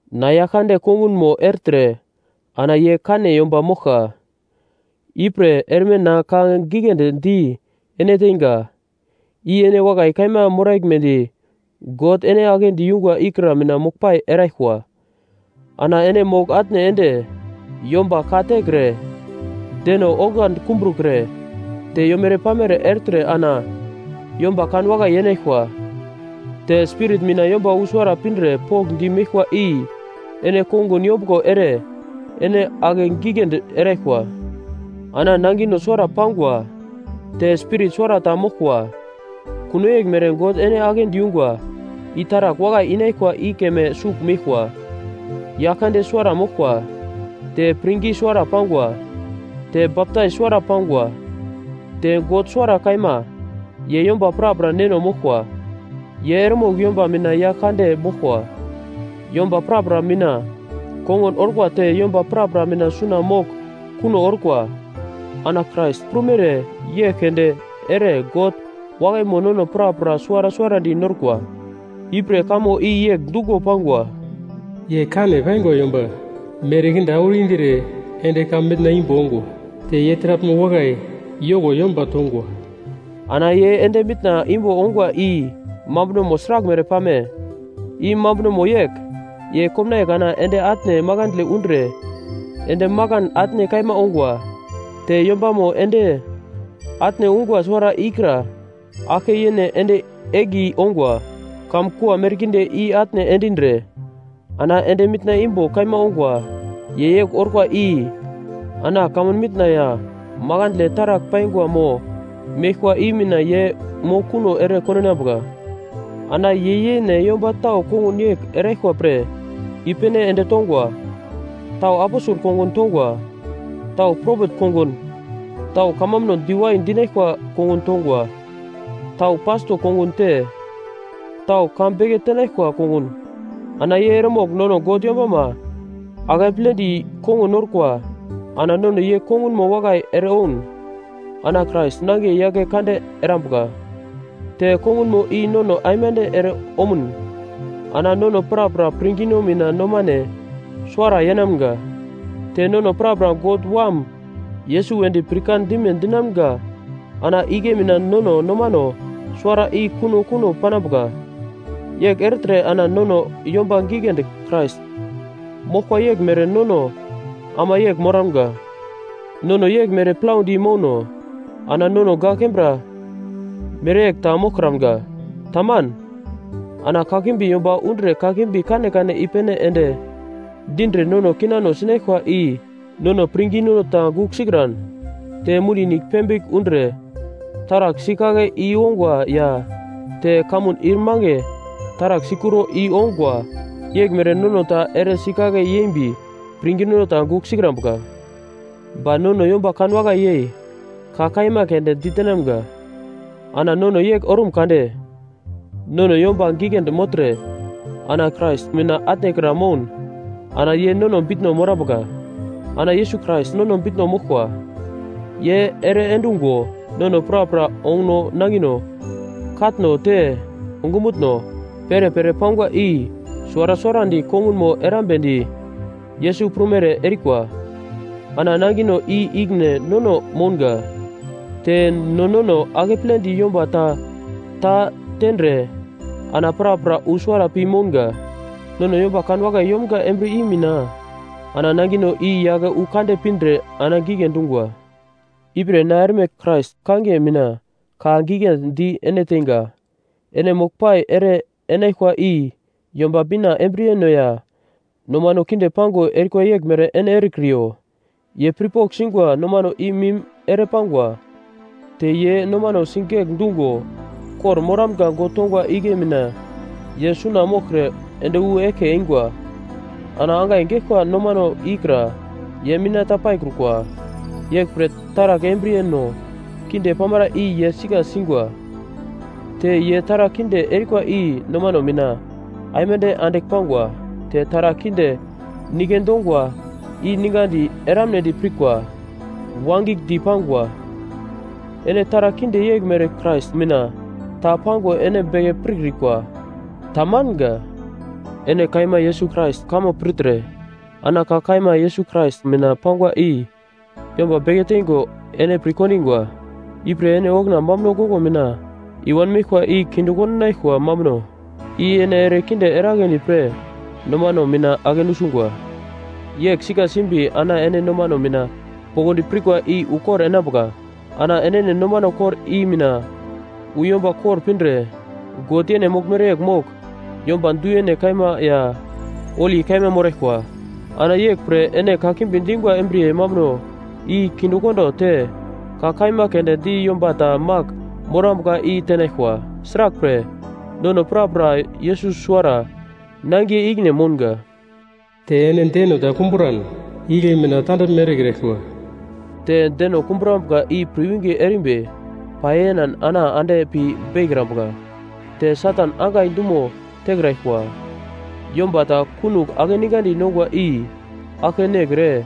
Na, Yaglkande kongunmo ertre ana ye kane yomba moglka, ipre erme na ka giglendi di ene teinga, i ene wakai kaima moraglmedi God ene aglendi yungwa ikra mina moglpai eraglkwa. Ana ene mogl-atne ende, yomba ka tekre, deno oglandi kumbrukre, te yomere-pamere ertre ana yomba kan wakai yenaglkwa. Te Spirit mina yomba wu suwara pindre pokndi meglkwa i ene kongun yombuglo ere ene ake giglendi eraglkwa. Ana nangino suwara pangwa, te Spirit suwara ta moglkwa, kuno yeglmere God ene aglendi yungwa i taragl wakai inaglkwa i keme sugl meglkwa. Yaglkande suwara moglkwa, te pirngi suwara pangwa, te baptais suwara pangwa, te God suwara kaima, ye yomba prapra Neno moglkwa, ye eremogl yomba mina yagl kande moglkwa, yomba prapra mina kongun orkwa te yomba prapra mina suna mogl kuno orkwa. Ana Krais prumere yegl keunde ere God wakaimo nono prapra suwara suwarandi norkwa. Ipre kamo i yegl dungo pangwa: “Ye kane paingwa yomba merkinde auro indre ende kamun mitna imbo ongwa, Te ye taraglmo wakai yoko yomba tongwa.” Ana ye ende mitna imbo ongwa i mambunomo sraglmere pame? I mambunomo yegl, ye komnaiye kana ende atne makandle undre ende makan atne kaima ongwa. Te yombamo ende atne ungwa suwara ikra aglke yene ende egli ongwa, kamkua merkinde i-atne endindre ana ende mitna imbo kaima ongwa, ye yegl orkwa i ana kamun mitna ya makandle taragl paingwa mo meglkwa i mina ye mogl kuno ere kondinambuka. Ana ye yene yomba tau kongun yegl eraglkwa pre i-pene ende tongwa: Tau aposel kongun tongwa, tau propet kongun, tau kamambuno diwai dinaglkwa kongun tongwa, tau pasto kongun te tau ka beke tenaglkwa kongun, ana ye eremogl nono God yombama akepledi kongun norkwa ana nono ye kongunmo wakai ere oun ana Krais nangiye yake kande erambuka. Te kongunmo i nono aimande ere omun ana nono prapra pirngino mina nomane suwara yenamga. Te nono prapra God Wam Yesus wedi pirkan dime dinamga ana igle mina nono nomano suwara i kuno kuno panambuka yegl ertre ana nono yomba giglendi Krais moglkwa yeglmere nono ama yegl moramga. Nono yeglmere plaudi mouno ana nono gak kembra mereyegl ta moglkramga. Taman. Ana kakimbi yomba undre kakimbi kanekane i-pene ende dindre nono kinano sinaglkwa i nono pirngino ta gugl sikran te mundi nigl pembigl undre taragl sikake i ongwa ya te kamun ir mange taragl sikuro i ongwa yeglmere nono ta ere sikake yembi pirngino ta gugl sikrambuka. Ba nono yomba kanwakai yei ka kaima keunde ditenamga. Ana nono yegl ormun kade, nono yomba giglendi mogltre ana Krais mina atne kra moun ana ye nono bitno morambuka. Ana Yesus Krais nono bitno moglkwa, ye ere endungo nono prapra onguno nangino katno, te ongumutno, perepere pangwa i suwara suwarandi kongunmo erambedi Yesus prumere erikwa. Ana nangino i ikine nono mounga, te no nono akepledi yomba ta ta tendre ana prapra wu suwara pi mounga. Nono yomba kanwakai yomga embriye i mina, ana nangino i yake wu kande pindre ana gigle dungwa. Ipre na erme Krais kangiye mina ka giglendi di ene teinga, ene moglpai ere enaglkwa i Yomba Bina embriyeno ya nomano kinde pango erikwa yeglmere ene erekriyo. Ye pirpogl singwa nomano i mim ere pangwa. Te ye nomano sigegl dungo kor-moramga God tongwa igle mina ye suna moglkre ende wu eglke eingwa. Ana angai geglkwa nomano ikra ye mina ta paikrukwa. Yeglpre taragl embriyeno kinde pamara i ye sika singwa, te ye taragl kinde erikwa i nomano mina aimande andigl pangwa, te taragl kinde nike dongwa i ningadi eramnedi pirkwa wagigldi pangwa. Ene taragl kinde yeglmere Krais mina ta pango ene beke pirkrikwa. Tamanga. Ene kaima Yesus Krais kamo pirtre, ana ka kaima Yesus Krais mina pangwa i yomba beke teingo ene pirkondingwa. Ipre ene okuna mambuno goglo mina i wanmeglkwa i kinde kondinaglkwa mambuno, i ene ere kinde eragledi pre nomano mina ake nusungwa. Yegl sika simbi ana ene nomano mina poglodi pirkwa i ukor enambuka, ana enene nomano kor i mina wu yomba kor pindre God yene moglmere yegl mogl, yomba du-yene kaima ya holi kaima moraglkwa. Ana yeglpre ene kakimbi dingwa embriye mambuno i kindekondo te ka kaima keunde di yomba ta magl morambuka i tenaglkwa, sraglpre, nono prapra Yesus suwara nangiye ikine mounga. Te ene deno ta kumburan, igle mina tandaglme erekraglkwa, te deno kumbrambuka i pirwinge erimbi pai enan ana ande pi beikrambuka, te Satan angai dumo tekraglkwa. Yomba ta kunogl akeningandi nongwa i aglke nekre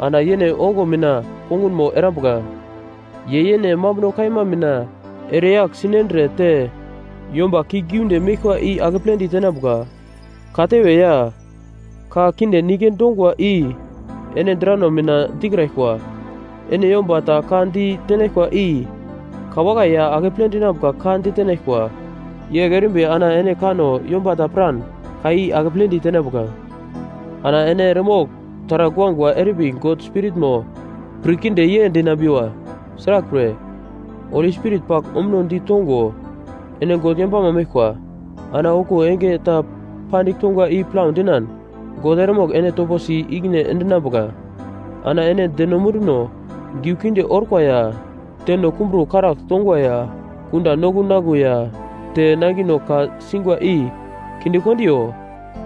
ana yene ongo mina kongunmo erambuka, ye yene mambuno kaima mina ere yagl sinendre te yomba kiuglgiunde meglkwa i akepledi tenambuka. Katewe ya ka kinde nike dongwa i ene drano mina dikraglkwa. Ene yomba ta ka di tenaglkwa i ka wakai ya akeple dinambuka ka ditenaglkwa, yegl erimbi ana ene kanno yomba ta piran ka i akepledi tenambuka. Ana ene eremogl taragl guagua erimbi God holi Spiritmo pir kinde ye dinambiwa, sraglpre, Holi Spirit pagl ombunodi tongo ene God yombama meglkwa, ana okuwo enge ta pandigl tongwa i plau dinan God eremogl ene topo si ikine endinambuka. Ana ene deno munduno giu kinde orkwa ya deno kumburo karagl tongwa ya kunda noglu naglu ya te nangino ka singwa i kindekondiyo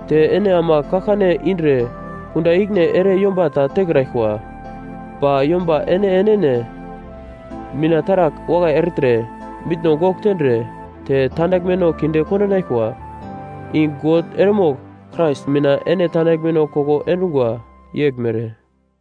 te ene ama kaglkane indre kunda ikine ere yomba ta tekraglkwa. Ba yomba ene enene mina taragl wakai ertre, mitno gogl tendre te tandaglmeno kinde kondinaglkwa, i God eremogl Krais mina ene tandaglmeno koko endungwa yeglmere.